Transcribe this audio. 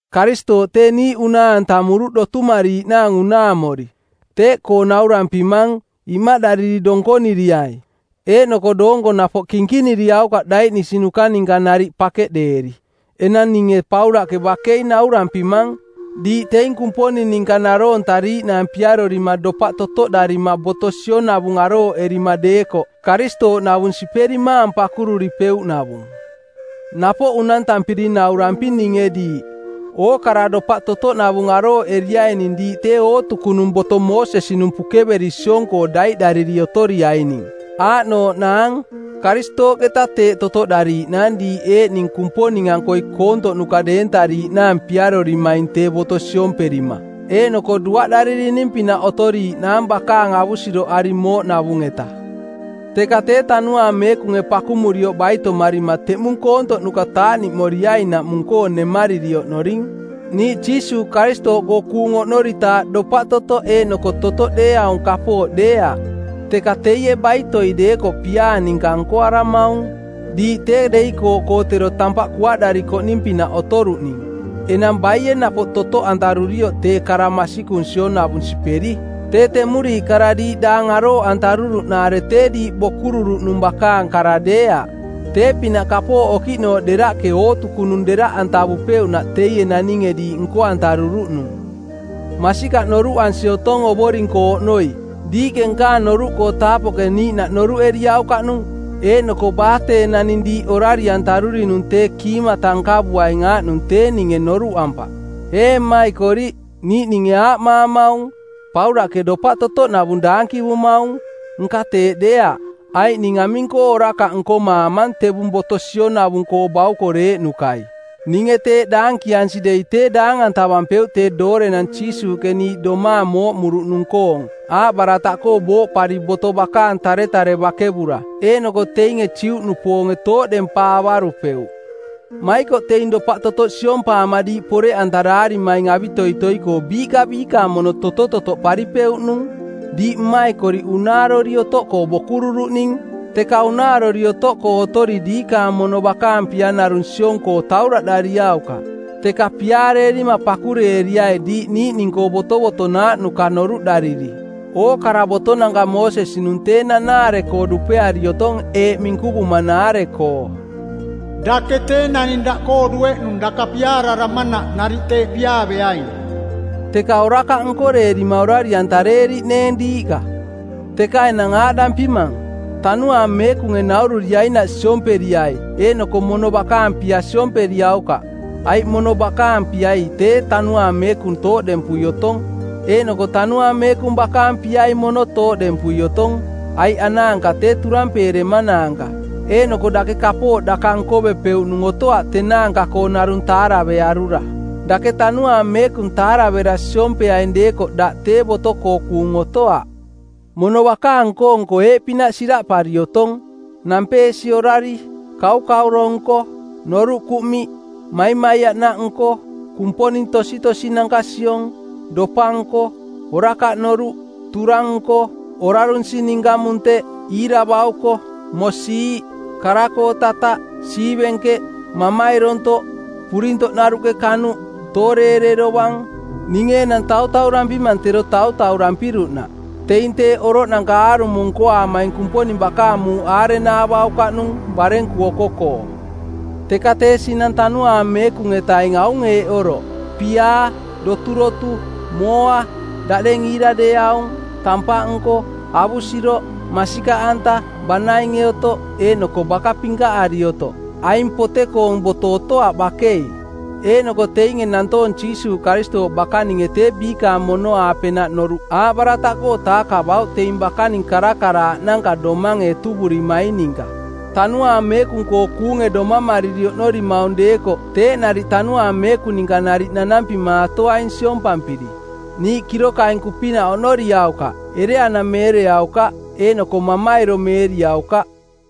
Karistooꞌ tee niiꞌ unaa-antamuruꞌ dotumariiꞌnaang unaamori. Teeꞌkoo naurampimang, imaꞌdariri donkoniriai, eeꞌnoko doonko napoꞌ kinkiniriaukaꞌ daiꞌnisinuka ninka nariꞌ pakeꞌdeeri. Enang ninge Paulaꞌke bakei naurampimang, diiꞌ teing Kumponing ninka naroontariiꞌnaang piarorima dopaꞌ totoꞌdarima boto sionavung arooꞌerima deekoꞌ, Karistooꞌnavung siperimaang pakururipeuꞌnavung. Napoꞌ unantampiri nauramping ninge diiꞌ, ookara dopaꞌ totoꞌnavung arooꞌeriaining diiꞌ tee ootukunung boto Moosesi-nung pukeveri siong-koo daiꞌdariri otoriaining. Aaꞌnooꞌnaang, Karistooꞌketa teeꞌ totoꞌdariiꞌnaang diiꞌ eeꞌning Kumponing-ankoi koontoꞌnuka deentariiꞌnaang piarorimaing tee boto siomperima, eeꞌnoko duaꞌdaririning-pinaꞌ otoriiꞌnaang bakaang avusiroꞌari mooꞌnavung-eta. Teka tee Tanuaang Meekunge pakumurioꞌ baitomarima teꞌmung koontoꞌnuka taaꞌniꞌmoriainaꞌmung-koo nemariri oꞌnoring. Niiꞌ Jiisuuꞌ Karistooꞌkoo kuung oꞌnoritaaꞌ dopaꞌ totoꞌ eeꞌnoko totoꞌ deeaung kapooꞌ deeaꞌ, teka teie baitoi deekoꞌ piaa ninka nkoaramaung. Diiꞌ tee deikooꞌkoo tero tampaꞌ kuaꞌdarikoꞌning-pinaꞌ otoruꞌning, enang baie napoꞌ totoꞌantarurioꞌ tee kara masikung sionavung siperi? Tee temuriiꞌ kara diiꞌ daang arooꞌantaruruꞌnaare tee diiꞌ bokururuꞌnung bakaang kara deeaꞌ. Tee-pinaꞌ kapooꞌ okiꞌnooꞌ deraꞌke ootukunung deraꞌantavupeuꞌnaꞌ teie naninge diiꞌ nko-antaruruꞌnung. Masikaꞌ noruꞌansi otong Ovoring-koo oꞌnoi, diiꞌke nkaang noruꞌkoo taapoꞌke niiꞌnaꞌ noruꞌeriaukaꞌnung eeꞌnoko baa tee naning diiꞌ orari-antarurinung tee kiimata nkavuaing aaꞌnung tee ninge noruꞌampaꞌ. Ee mmaikoriꞌ, niiꞌninge aaꞌmaamaung, “Paulaꞌke dopaꞌ totoꞌnavung daankivumaung.” Nka teeꞌ deeaꞌ, aiꞌ ning aming-koo orakaꞌ nkomaamang tevung boto sionavung-koo baukoreeꞌnukai? Ninge teeꞌ daankiansi dei tee daang-antavampeuꞌ tee doorenang Jiisuuꞌke niiꞌ domaang mooꞌmuruꞌnung-koong, aaꞌbarataꞌkoo booꞌpari boto bakaang taretare bakevura, eeꞌnoko teinge Juꞌnupoonge tooꞌdempaavarupeuꞌ. Maikoꞌ teing dopaꞌtotoꞌ siompaama diiꞌ poreꞌantaraarimaing avitoitoi-koo biiꞌka biikaang mono totototoꞌparipeuꞌnung. Diiꞌ mmaikoriꞌ unaarori otoꞌkoo bokururuꞌning, teka unaarori otoꞌkoo otori diikaang mono bakaang pia narung siong-koo tauraꞌdariaukaꞌ, teka piaareerima pakureeriai diiꞌ niiꞌning-koo botovotonaaꞌnuka noruꞌdariri. Ookara botonanka Moosesi-nung tee nanaare-koo dupeari otong eeꞌ minkuvumanaare-koo: “Dake tee naning daꞌkoo dueꞌnung daka piaararamanaꞌ nariꞌ teeꞌ piaaveaing.” Teka orakaꞌ nkoreerima orari-antareeriꞌneeng diiꞌka. Teka enang aaꞌdampimang, Tanuaang Meekunge naururiainaꞌ siomperiai eeꞌnoko mono bakaang pia siomperiaukaꞌ. Aiꞌ mono bakaang piai tee Tanuaang Meekung tooꞌdempui otong eeꞌnoko Tanuaang Meekung bakaang piai mono tooꞌdempui otong, aiꞌ anaanka tee turampeeremanaanka eeꞌnoko dake kapooꞌ daka nkovepeuꞌnung otoaꞌ tenaanka-koo narung taaravearura. Dake Tanuaang Meekung taaravera siompeaing deekoꞌ daꞌ tee boto-koo kuung otoaꞌ. Mono bakaang nko-nko eeꞌpinaꞌ siraꞌpari otong: nampeesi orari, kaukauro-nko, noruꞌ kuꞌmiꞌ, maimaiaꞌnaꞌ nko, kumponing tositosinanka siong, dopa-nko, orakaꞌ noruꞌ, turang-nko, orarunsi ninka munteꞌ, iira bauko, mosiiꞌ, kara-koo tataꞌ, siivenkeꞌ, mamairontoꞌ, purintoꞌnaruꞌke kanuꞌ, tooreere dovang; Ninge enang tautaurampimang tero tautaurampiruꞌnaꞌ: Teing teeꞌ oroꞌnanka aarumo nkoaamaing Kumponing bakaang muuꞌ aarenaavaukaꞌnung barenku oko-koo. Teka tee sinang Tanuaang Meekung-etaing aung eeꞌ oroꞌ: piaa, doturotu, mooa, daꞌdeng iira deeaung, tampaꞌ nko, avusiroꞌ, masikaꞌanta, banainge otoꞌ, eeꞌnoko baka pinkaꞌari otoꞌ; Aing pote-koong boto otoaꞌ bakei. Eeꞌnoko teinge nantoong Jiisuuꞌ Karistooꞌ bakaninge tee biikaang mono-aapenaꞌ noruꞌ aaꞌbarataꞌkoo taakavauꞌ teing bakaning karakaraaꞌnanka domange etuvurimaing ninka. Tanuaang Meekung-koo kuunge domamariri oꞌnorimaung deekoꞌ, teeꞌ nariꞌ Tanuaang Meekung ninka nariꞌ nanampimaatoaing siompampiri. Niiꞌ kirokainku-pinaꞌ oꞌnoriaukaꞌ, ereanameereaukaꞌ eeꞌnoko mamairomeeriaukaꞌ.